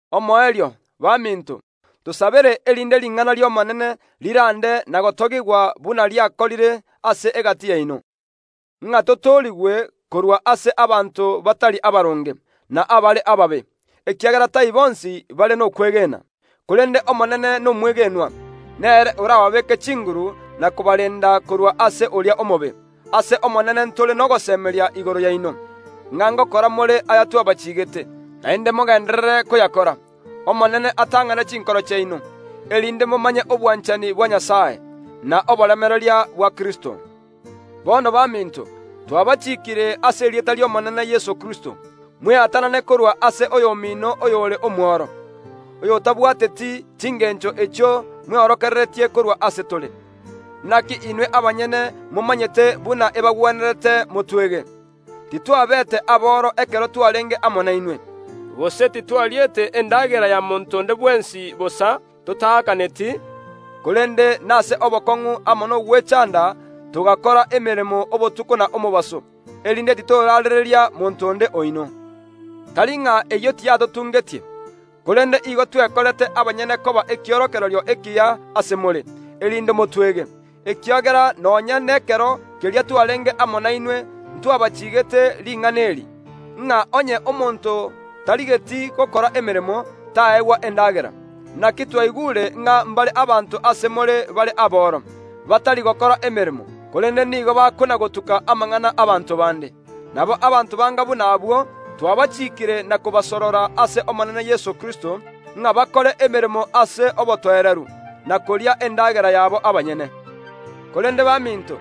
Omoerio, baminto, tosabere erinde ring’ana ri’Omonene rirande na gotogigwa buna riakorire ase egati yaino, ng’a totoorigwe korwa ase abanto batari abaronge, na abare ababe, ekiagera tai bonsi bare nokwegena. Korende Omonene nomwegenwa, nere orababeeke chinguru na kobarenda korwa ase oria omobe. Ase Omonene ntore nogosemeria igoro yaino, ng’a ngokora more ayatwabachiigete, naende mogenderere koyakora. Omonene atang’ane chinkoro chiaino, erinde momanye obwanchani bwa Nyasae, na oboremereria bwa Kristo. Bono baminto, twabachikiire ase erieta ri’Omonene Yeso Kristo, mweatanane korwa ase oyomino oyore omworo, oyotabwateti chingencho echio mweorokereretie korwa ase tore. Naki inwe abanyene momanyete buna ebagwenerete motwege; titwabeete aboro ekero twarenge amo nainwe, gose titwariete endagera ya monto onde bwensi bosa, totaakaneti, korende nase obokong’u amo nogwechanda togakora emeremo obotuko na omobaso, erinde titoraarereria monto onde oino. Tari ng’a eyio tiyatotungetie, korende igo twekorete abanyene koba ekiorokererio ekiya ase more, erinde motwege. Ekiagera nonya nekero keria twarenge amo nainwe ntwabachiigete ring’ana eri, ng’a onye omonto tarigeti gokora emeremo, taegwa endagera. Naki twaigure ng’a mbare abanto ase more bare aboro, batari gokora emeremo, korende nigo bakona‐gotuka amang’ana y’abaanto bande. Nabo abanto banga buna abwo twabachikiire na kobasorora ase Omonene Yeso Kristo, ng’a bakore emeremo ase obotoereru, na koria endagera yabo abanyene. Korende baminto,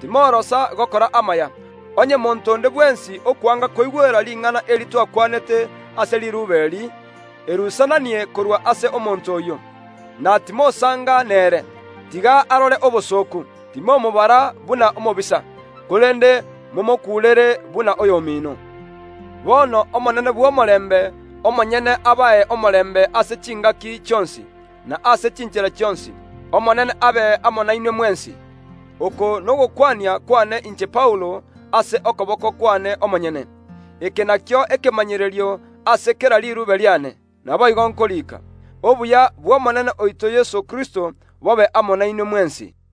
timorosa gokora amaya. Onye monto onde bwensi okwanga koigwera ring’ana eri tokwanete ase riruube eri, erusananie korwa ase omonto oyio, na timosanga nere; tiga arore obosooku. Timomobara buna omobisa, korende momokuurere buna oyomino. Bono Omonene bw’omorembe omonyene abae omorembe ase chingaki chionsi, na ase chinchera chionsi. Omonene abe amo nainwe mwensi. Oko nogokwania kwane inche Paulo ase okoboko kwane omonyene. Eke nakio ekemanyerio ase kera riruube riane; naboigo nkoriika. Obuya bw’Omonene oito Yeso Kristo bobe amo nainwe mwensi.